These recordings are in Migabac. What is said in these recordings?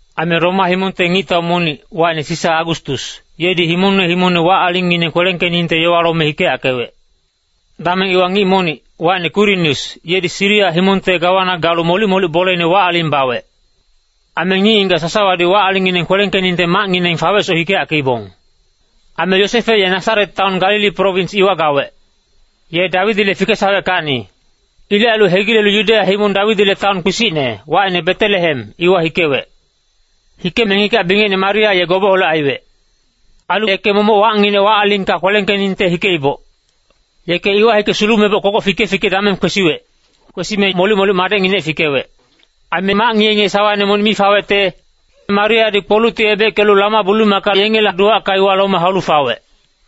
Aime Roma himongte ngictau monic, wacine Sisa Agustus, yedi himongne himongne wac-alingngineng kwelengkeningte yowa lome hikeyackewec. Dameng iwa ngic monic, wacine Kwirinius, yedi Siria himongte gawana galu molic-molic boleine wac-aling bawec. Aime ngic-ngigac sasawadi wac-alingngineng kwelengkeningte macngineng fawecsoc hikeyackeibong. Aime Yosefe ye Nasaret taon Galili prowins iwa gawec. Ye Dawidile fikesaweckacni. Ilec ailu hegilelu Yudeya himong Dawidile taon kpisicne, wacine Betelehem, iwa hikewec. Hikeme ngigac-bingecine Maria ye gobeholec aiwec. Ailu yeke momoc wacnginec wac-alingka kwelengkeningte hikeiboc. Yeke iwa hike sulumeboc kogoc fike-fike dameng kwesiwec. Kwesime molic-molic madecnginec fikewec. Aime mac ngiye-ngiye sawaine monic mi fawecte, Mariadi kpolucti ebeckelu lama-bulumaka yengele duwacka iwa lome haulu fawec.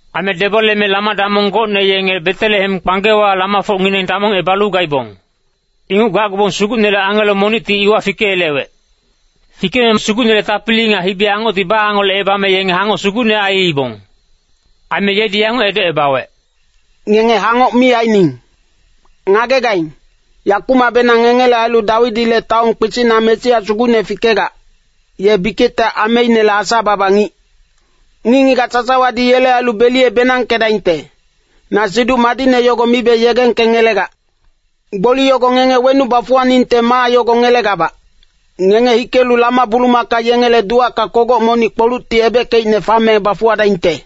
Aime deboleme lama-damong gocne yenge Betelehem kpanggewa lamafocngineng damongebalu gaibong. Inguc gacgubong Sugucnele angelo monicti iwa fikeyelewec. Fikeme Sugucnele tapili nga hibi-angocti baangolecebame yenge hangoc sugucne aiibong. Aime yedi yanguc edocebawec, “Ngenge hangoc mi aining! Ngagegaing, yakumacbenang ngengele ailu Dawidile taon kpisicna Mesia Sugucne fikegac, ye bikicte ameinele Asa-baba ngic. Ngic-ngigac sasawadi yele ailu beliye-benangkedaingte, na Siduc Madicne yogo mibe yegengkengelegac. Gboli yogo ngenge wenuc bafuwaningte maa yago ngelegabac, ngenge hikelu lama-bulumaka yengele duwacka kogoc monic kpolucti ebeckeicne fame bafuwadaingte.”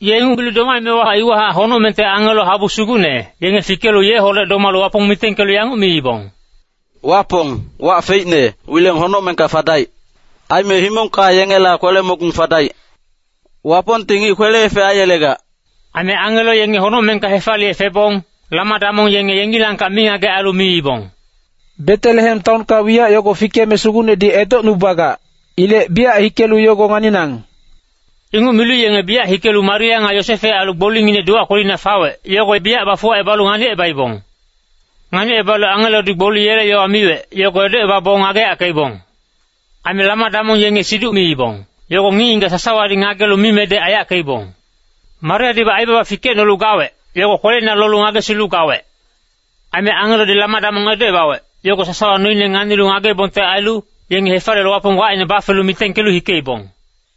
Ye inguc milu domaemewa iwahac honocmengte angelo habu sugucne, yenge fikelu yeholec domalu Wapong mitengkelu yanguc miibong, “Wapong, wac feicne, wileng honocmengka fadaic. Aime himongka yengela kwele-mogung fadaic. Wapongti ngic kwele-efec aiyelegac.” Aime angelo yenge honocmengka hefaliye febong, lama-damong yenge yengilangkac mingagec ailu miibong, “Betelehem taonka wiyac yogo fikeme Sugucnedi edocnubagac, ilec biyac hikelu yogo nganinang.” Inguc milu yenge biyac hikelu Maria nga Yosefe ailu gbolinginec duwac kwelina fawec, yogo biyac bafuwacebalu nganicebaibong. Nganicebalu angelodi gboli yele yowa miwec, yogo edocebabong ngageyackeibong. Aime lama-damong yenge siduc miibong, yogo ngic-ngigac sasawadi ngagelu mimedec aiyackeibong. Mariadibac aibaba fikecnolu gawec, yogo kweleina lolu ngagesilu gawec. Aime angelodi lama-damong edocebawec, yogo sasawa noine nganilu ngageibongte ailu, yenge hefaliyelu Wapong wacine bafelu mitengkelu hikeibong.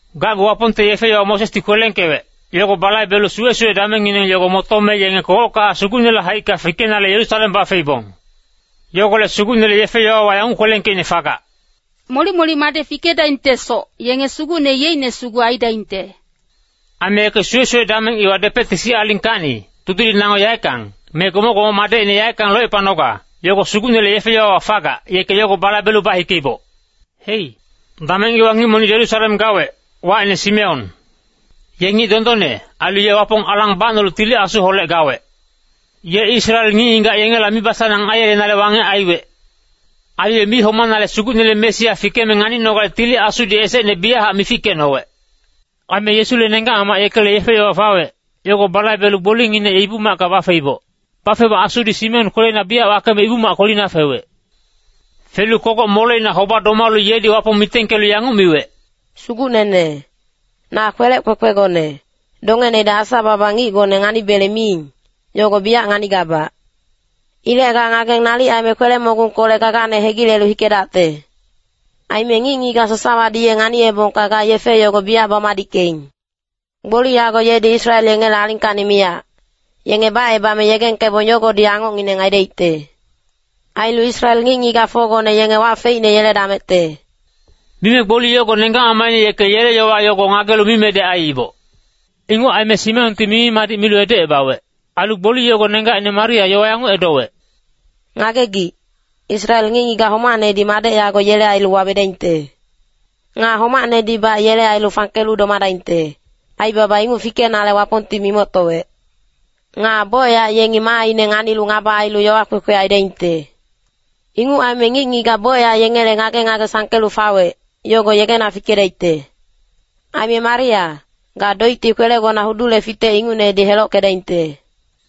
Gacgu Wapongte yefe-yowa Mosesdi kwelengkewec, yogo balaibelu suwe-suwe damengngineng yogo motome yenge kogockahac Sugucnele haicka fikenale Yerusalem bafeiboc. Yogolec Sugucnele yefe-yowawa yanguc kwelengkeicne fagac, “Molic-molic madec fikedaingtesoc, yenge Sugucne yeicne sugu aidaingte.” Aime yeke suwe-suwe dameng iwa depecte sic alingkacni tudiling nango yaeckang, me gomoc-gomoc madecine yaeckang locepanoga, yogo Sugucnele yefe-yowawa fagac, yeke yogo balaibelu bahikeiboc. Hei, dameng iwa ngic monic Yerusalem gawec, wacine Simeon. Ye ngic dondonne, ailu ye Wapong alang bacnolu Tili Asuholec gawec. Ye Israel ngic-ngigac yengela mibasanang aiyelenale wangec gawec. Ailu ye mi homame Sugucnele Mesia fikeme nganinogale Tili Asudi esecne biyachac mifikecnowec. Aime Yesule nenggac-mamac yekele yefe-yowa fawec, yogo balaibelu gbolinginec Ibu-macka bafeiboc. Bafeboc Asudi Simeon kweleina biyac wakeme Ibu-mac kwelina fewec. Felu kogoc moleina hoba-domalu yedi Wapong mitengkelu yanguc miwec, “Sugucnene, na kwelec kwekwegone, dongenedi Asa-baba ngicgone nganibele miing, yogo biyac nganigabac. Ilec ga ngageng nalic aime kwele-mogungkolec gagane hegilelu hikedacte. Aime ngic-ngigac sasawadi ye nganiyebongka ga yefe yogo biyac bamadickeing. Gboli yago yedi Israel yengele alingkacni miyac, yenge bacebame yegengkebong yogodi angocngineng aidaicte. Ailu Israel ngic-ngigacfocgone yenge wac feicne yeledamecte.” Mime gboli yogo nenggac-mamacine yeke yele yowa yogo ngagelu mimedec aiiboc. Inguc aime Simeonti mimi-madic milu edocebawec. Ailu gboli yogo nenggacine Maria yowa yanguc edowec, “Ngagegic, Israel ngic-ngigac homacnedi madec yago yele ailu wawedaingte. Nga homacnedibac yele ailu fangkelu domadaingte, aibaba inguc fikenale Wapongti mimoctowec. Nga bocyac yengi maaine nganilu ngaba ailu yowa kwekwe aidaingte. Inguc aime ngic-ngigac bocyac yengele ngage-ngage sangkelu fawec, yogo yegena fikedaicte. Aime Maria, ga doicti kwelegona hudule fitec ingucnedi helockedaingte.”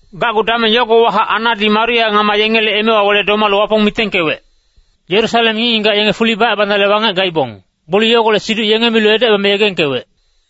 Gacgu dameng yogowahac Annadi Maria ngama yengele emewa wele domalu Wapong mitengkewec. Yerusalem ngic-ngigac yenge fuli bacebanale wangec gaibong, gboli yogolec siduc yenge milu edocebame yegengkewec.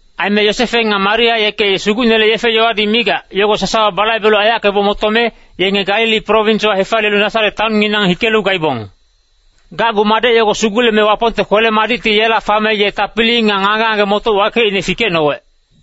Aime Yosefe nga Maria yeke Sugucnele yefe-yowadi migac, yogo sasawa balaibelu aiyackeboc motome, yenge Galili prowinswa hefaliyelu Nasaret taonnginang hikelu gaibong. Gacgu madec yogo suguleme Wapongte kwele-madicti yela fame, ye tapili nga ngage-ngage-motoc wakeicne fikecnowec.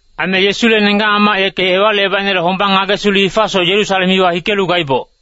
Aime Yesule nenggac-mamac yeke Ewalicebaicnele hombang ngagesilu hifasoc Yerusalem iwa hikelu gaiboc.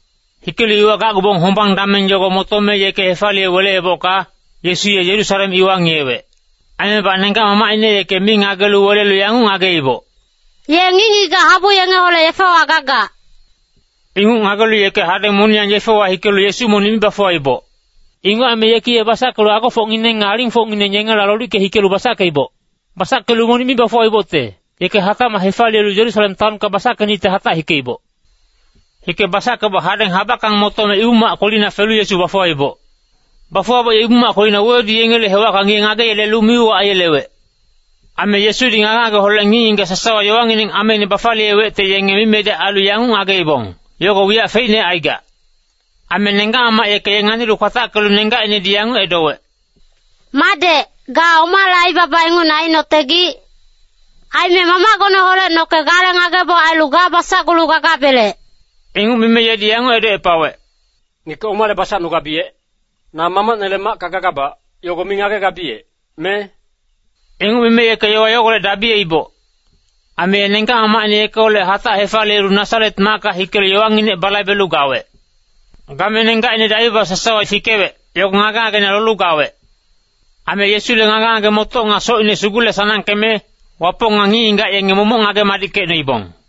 Hikelu iwa gacgubong hombang dameng yogo motome yeke hefaliye weleebocka, Yesu ye Yerusalem iwa ngiyewec. Aimebac nenggac-mamacine yeke mi ngagelu welelu yanguc ngageiboc, “Ye ngic-ngigac habu yengeholec yefewa gagac.” Inguc ngagelu yeke hadeng moniyang yefewa hikelu Yesu monic mi bafuwaiboc. Inguc aime yeki ye basackelu agofocngineng nga alingfocngineng yengela lolicke hikelu basackeiboc. Basackelu monic mi bafuwaibocte, yeke hatacmac hefaliyelu Yerusalem taonka basackenicte hatac hikeiboc. Hike basackeboc hadeng habackang motome, Ibu-mac kwelina felu Yesu bafuwaiboc. Bafuwaboc ye Ibu-mac kwelina wewedu yengele hewacka ngiye ngageyelelu mi-uwac aiyelewec. Aime Yesudi ngage-ngageholec ngic-ngigac sasawa yowangineng ameine bafaliyewecte, yenge mimedec ailu yanguc ngageibong, yogo wiyac feicne aigac. Aime nenggac-mamac yeke ye nganilu kwatackelu nenggacinedi yanguc edowec, “Madec, ga omale aibaba ingucne ainotegic? Aime mamacgoneholec noke gale ngageboc ailu ga basacgulu gagabelec.” Inguc mime yedi yanguc edocepawec, “Ngeke omale basacnugabiyec? Na mamacnele macka gagabac, yogo mi ngagegabiyec, me?” Inguc mime yeke yowa yogolec dabiyeiboc. Ailu ye nenggac-mamacine yekeholec hatac hefaliyelu Nasaret macka hikelu yowanginec balaibelu gawec. Game nenggacinedi aibaba sasawa fikewec, yogo ngage-ngageina lolu gawec. Aime Yesule ngage-ngage-motoc nga socine sugule-sanangkeme, Wapong nga ngic-ngigac yenge momoc ngage-madickecnoibong.